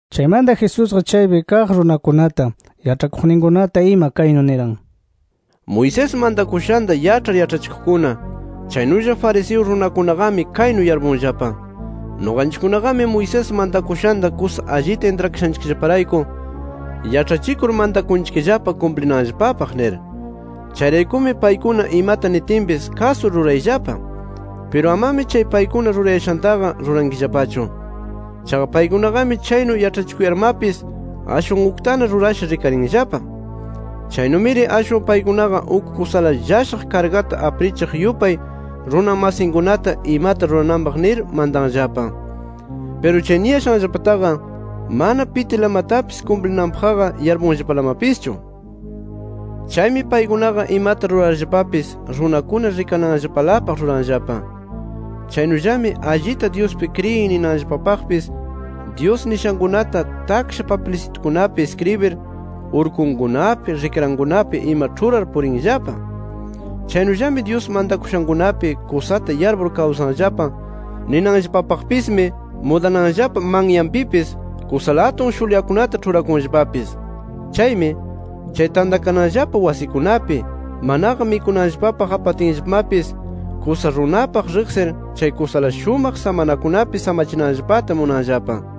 Chaymanta Jesusqa chaypi kaq runakunata, yaĉhakuqninkunata ima kaynu niran: “Moisés mantakushanta yaĉhar yaĉhachikuqkuna, chaynulla fariseo runakunaqami kaynu yarpunllapa: ‘Nuqanchikkunaqami Moisés mantakushanta kusa allita intrakashanchikllaparayku, yaĉhachikur mantakunchikllapa kumplinanllapapaq’ nir. Chayraykumi, paykuna imata nitinpis kasur rurayllapa. Piru amami chay paykuna rurayashantaqa rurankillapachu. Chaqa paykunaqami chaynu yaĉhachikuyarmapis, ashwan uktana rurasha rikarinllapa. Chaynumiri ashwan paykunaqa uk kusala llashaq kargata aprichiq yupay runa masinkunata imata rurananpaq nir mantanllapa. Piru chay niyashanllapataqa mana pitilamatapis kumplinanpaqqa yarpunllapalamapischu. “Chaymi paykunaqa imata rurarllapapis runakuna rikananllapalapaq ruranllapa. Chaynullami allita Dyuspi kriyin ninanllapapaqpis Dyus nishankunata taksha papilsitukunapi iskribir urkunkunapi, rikrankunapi ima ĉhurar purinllapa. Chaynullami Dyus mantakushankunapi kusata yarpur kawsanllapa ninanllapapaqpismi mudananllapa manyanpipis kusala atun shulyakunata ĉhurakunllapapis. Chaymi, chay tantakananllapa wasikunapi, manaqa mikunanpaq apatinllapamapis, kusa runapaq riqsir chay kusala shumaq samanakunapi samachinanllapata munanllapa.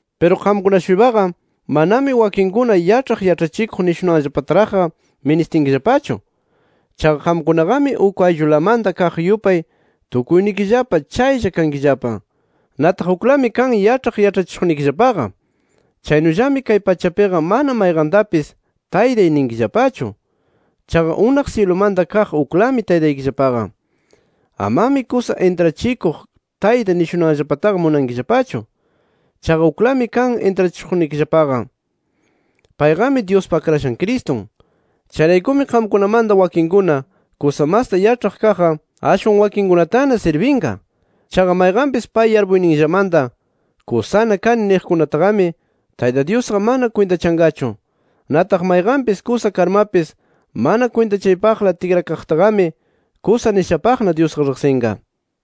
“Piru qamkuna-shuypaqa manami wakinkuna ‘Yaĉhaq yaĉhachikuq’ nishunanllapataraqqa ministinkillapachu. Chaqa qamkunaqami uk ayllulamanta kaq yupay tukuynikillapa chaylla kankillapa. Nataq uklami kan yaĉhaq yaĉhachishuqnikillapaqa. Chaynullami kay pachapiqa ama mayqantapis, ‘Taytay’ ninkillapachu. Chaqa unaq syilumanta kaq uklami Taytaykillapaqa. Amami ‘Kusa intrachikuq tayta’ nishunanllapataqa munankillapachu. Chaqa uklami kan intrachishuqnikillapaqa. Payqami Dyuspa Akrashan Cristun. Chayraykumi qamkunamanta wakinkuna kusa masta yaĉhaq kaqqa, ashwan wakinkunatana sirbinqa. Chaqa mayqanpis pay yarpuyninllamanta ‘Kusana kani’ niqkunataqami Tayta Dyusqa mana kwintachanqachu. Nataq mayqanpis kusa karmapis mana kwintachaypaqla tikrakaqtaqami kusa nishapaqna Dyusqa riqsinqa”.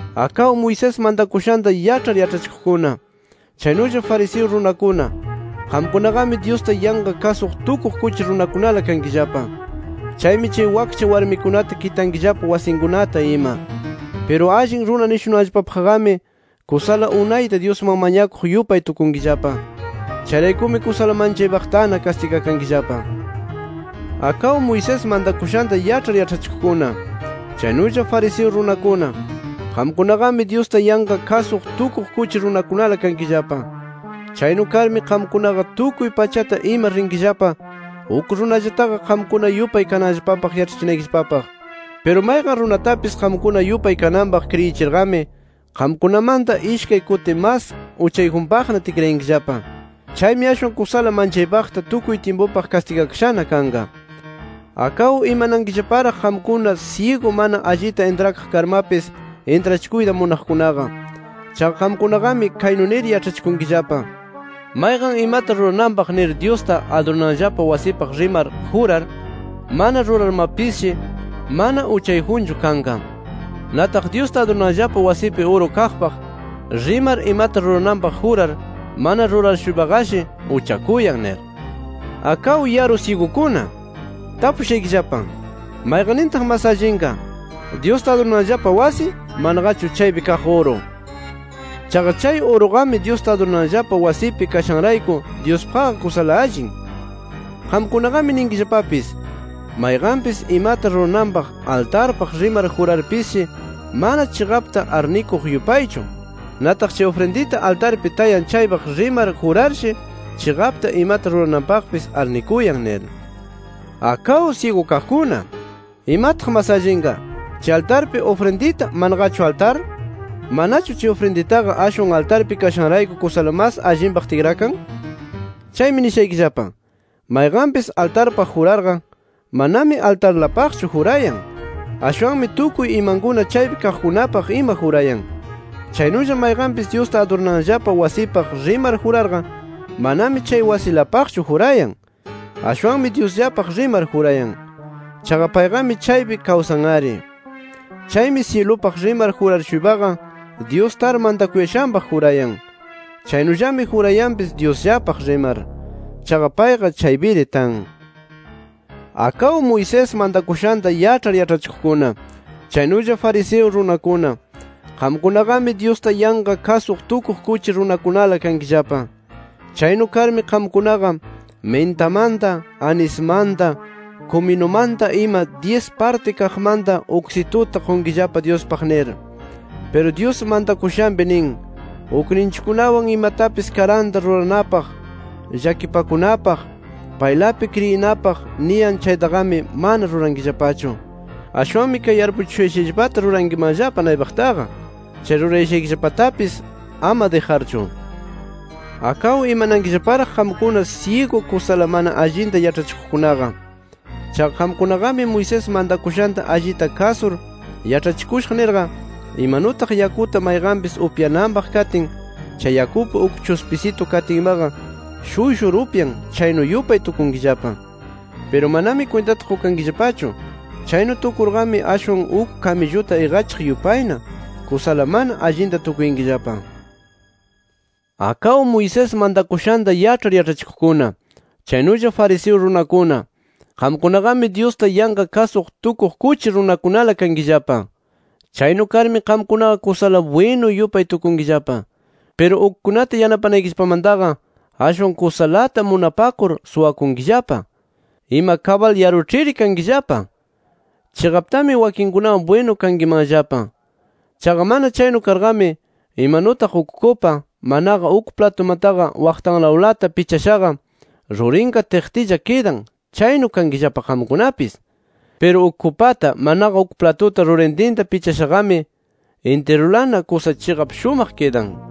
“¡Akaw Moisés mantakushanta yaĉhar yaĉhachikuqkuna, chaynulla fariseo runakuna, qamkunaqami Dyusta yanqa kasuq tukuq kuchi runakunala kankillapa! Chaymi chay wakcha warmikunata kitankillapa wasinkunata ima. Piru allin runa nishunanllapapaqqami kusala unayta Dyusman mañakuq yupay tukunkillapa. Chayraykumi kusala manchaypaqtana kastigakankillapa.] “¡Akaw Moisés mantakushanta yaĉhar yaĉhachikuqkuna, chaynulla fariseo runakuna, qamkunaqami Dyusta yanqa kasuq tukuq kuchi runakunala kankillapa! Chaynu karmi qamkunaqa tukuy pachata ima rinkillapa uk runallataqa qamkuna yupay kananllapapaq yaĉhachinaykillapapaq. Piru mayqan runatapis qamkuna yupay kananpaq kriyichirqami, qamkunamanta ishkay kuti mas uchayjunpaqna tikrayankillapa. Chaymi ashwan kusala manchaypaqta tukuy tyimpupaq kastigakashana kanqa. “¡Akaw imanankillaparaq qamkuna syigu mana allita intrakaq karmapis intrachikuyta munaqkunaqa! Chaqa qamkunaqami, kaynu nir yaĉhachikunkillapa: ‘Mayqan imata rurananpaq nir Dyusta adurananllapa wasipaq rimar jurar, mana rurarmapisshi mana uchayjunchu kanqa. Nataq Dyusta adurananllapa wasipi uru kaqpaq rimar imata rurananpaq jurar mana rurar-shuypaqashi uchakuyan’ nir. ¡Akaw yaru syigukuna! Tapushaykillapa: ¿Mayqannintaq mas allinqa, Dyusta adurananllapa wasi, manaqachu chaypi kaq uru? Chaqa chay uruqami Dyusta adurananllapa wasipi kashanrayku Dyuspaqqa kusala allin. “Qamkunaqami ninkillapapis: ‘Mayqanpis imata rurananpaq altarpaq rimar jurarpisshi mana chiqapta arnikuq yupaychu. Nataq chay ufrindita altarpi tayan chaypaq rimar jurarshi, chiqapta imata rurananpaqpis arnikuyan’ nir. ¡Akaw syigu kaqkuna! ¿Imataq mas allinqa: Chay altarpi ufrindita, manaqachu altar? ¿Manachu chay ufrinditaqa ashwan altarpi kashanrayku kusala mas allinpaq tikrakan? Chaymi nishaykillapa: Mayqanpis, altarpaq jurarqa, manami altarlapaqchu jurayan. Ashwanmi tukuy imankuna chaypi kaqkunapaq ima jurayan. Chaynulla mayqanpis Dyusta adurananllapa wasipaq rimar jurarqa, manami chay wasilapaqchu jurayan. Ashwanmi Dyusllapaq rimar jurayan. Chaqa payqami chaypi kawsan-ari. Chaymi syilupaq rimar juraq-shuypaqa, Dyus tar mantakuyashanpaq jurayan. Chaynullami jurayanpis Dyusllapaq rimar. Chaqa payqa chaypiri tan. “¡Akaw Moisés mantakushanta yaĉhar yaĉhachikuqkuna, chaynulla fariseo runakuna, qamkunaqami Dyusta yanqa kasuq tukuq kuchi runakunala kankillapa! Chaynu karmi qamkunaqa mintamanta, anismanta, kuminumanta ima dyis parti kaqmanta uksituta qunkillapa Dyuspaq nir. Piru Dyus mantakushanpi nin: Ukninchikkunawan imatapis karanta ruranapaq, llakipakunapaq, paylapi kriyinapaq niyan chaytaqami mana rurankillapachu. Ashwanmi kay yarpuchishushayllapata rurankimanllapa naypaqtaqa, chay rurayashaykillapatapis ama dijarchu. “¡Akaw imanankillaparaq qamkuna syigu kusala mana allinta yaĉhachikuqkunaqa! Chaqa qamkunaqami Moisés mantakushanta allita kasur yaĉhachikushaq nirqa, imanutaq yakuta mayqanpis upyananpaq katin, chay yakupi uk chuspisitu katinmaqa shuyshur upyan, chaynu yupay tukunkillapa. Piru manami kwintata qukankillapachu, chaynu tukurqami ashwan uk kamilluta iqachiq yupayna kusala mana allita tukuyankillapa. “¡Akaw Moisés mantakushanta yaĉhar yaĉhachikuqkuna, chaynulla fariseo runakuna, qamkunaqami Dyusta yanqa kasuq tukuq kuchi runakunala kankillapa! Chaynu karmi qamkunaqa kusala bwinu yupay tukunkillapa. Piru ukkunata yanapanaykillapamantaqa ashwan kusalata munapakur suwankillapa. ¡Ima kabal yaruĉhiri kankillapa! Chiqaptari wakinkunawan bwinu kankimanllapa. Chaqa mana chaynu karqami, imanutaq uk kupa, manaqa uk platumataqa waqtanlawlata pichashaqa, rurinqa tiqtilla kidan, chaynu kankillapa qamkunapis. Piru uk kupata manaqa uk platuta rurintinta pichashaqami, intirulana kusa chiqap shumaq kidan.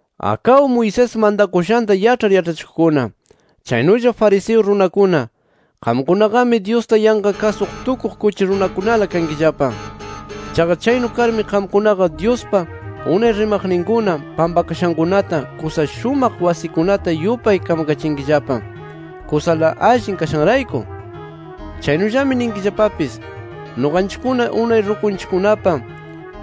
“¡Akaw Moisés mantakushanta yaĉhar yaĉhachikuqkuna, chaynulla fariseo runakuna, qamkunaqami Dyusta yanqa kasuq tukuq kuchi runakunala kankillapa! Chaqa chaynu karmi qamkunaqa Dyuspa unay rimaqninkuna pampakashankunata kusa shumaq wasikunata yupay kamakachinkillapa, kusala allin kashanrayku. Chaynullami ninkillapapis: ‘Nuqanchikkuna unay rukunchikkunapa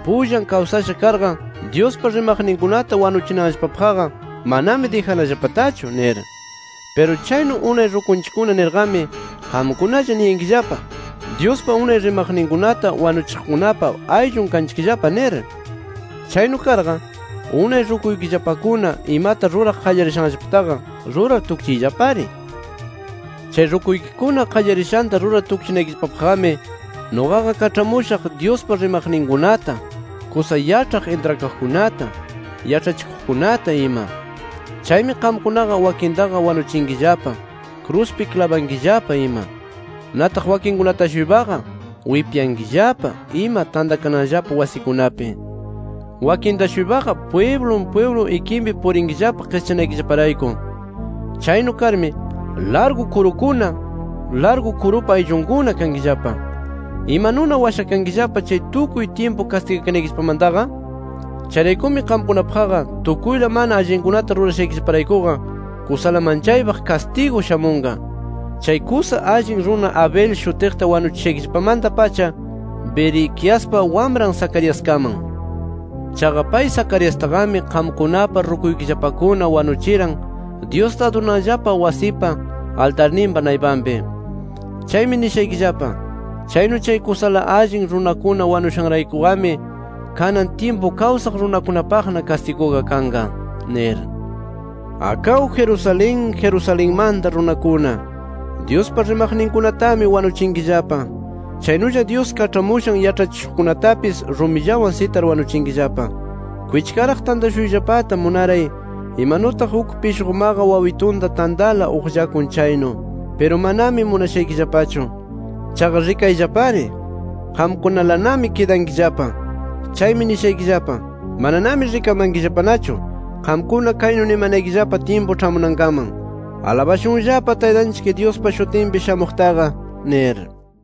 pullan kawsasha karqa, Dyuspa rimaqninkunata wanuchinanllapapaqqa manami dijanallapatachu’ nir. Piru chaynu unay rukunchikkuna nirqami, qamkunalla niyankillapa: ‘Dyuspa unay rimaqninkunata wanuchiqkunapa ayllun kanchikllapa’ nir. ¡Chaynu karqa, unay rukuykillapakuna imata ruraq qallarishanllapataqa rurar tukchiyllapari! “Chay rukuykikuna qallarishanta rurar tukchinaykillapapaqqami nuqaqa kaĉhamushaq Dyuspa rimaqninkunata, kusa yaĉhaq intrakaqkunata, yaĉhachikuqkunata ima. Chaymi qamkunaqa wakintaqa wanuchinkillapa, kruspi klabankillapa ima. Nataq wakinkunata-shuypaqa wipyankillapa ima tantakananllapa wasikunapi. Wakinta-shuypaqa pwiblun pwiblun ikinpi purinkillapa qischanaykillaparayku. Chaynu karmi ¡largu kurukuna, largu kurupa ayllunkuna kankillapa! ¿Imanuna washakankillapa chay tukuy tyimpu kastigakanaykillapamantaqa? Chayraykumi qamkunapaqqa tukuyla mana allinkunata rurashaykillaparaykuqa kusala manchaypaq kastigu shamunqa. Chay kusa allin runa Abel shutiqta wanuchishaykillapamanta-pacha Berequiaspa wamran Zacariaskaman. Chaqa pay Zacariastaqami qamkunapa rukuykillapakuna wanuchiran Dyusta adurananllapa wasipa, altarninpa naypanpi. Chaymi nishaykillapa: Chaynu chay kusala allin runakuna wanushanraykuqami, kanan tyimpu kawsaq runakunapaqna kastiguqa kanqa nir. “¡Akaw Jerusalén, Jerusalenmanta runakuna! Dyuspa rimaqninkunatami wanuchinkillapa. Chaynulla Dyus kaĉhamushan yaĉhachishuqkunatapis rumillawan sitar wanuchinkillapa. Kwichkaraq tantashuyllapata munaray, imanutaq uk pishqumaqa wawitunta tantala uqllakun chaynu. Piru manami munashaykillapachu. Chaqa rikayllapari, qamkunalanami kidankillapa. Chaymi nishaykillapa: Mananami rikamankillapanachu qamkuna kaynu nimanaykillapa tyimpu ĉhamunankaman: ‘¡Alabashunllapa Taytanchik Dyuspa shutinpi shamuqtaqa!’ nir”.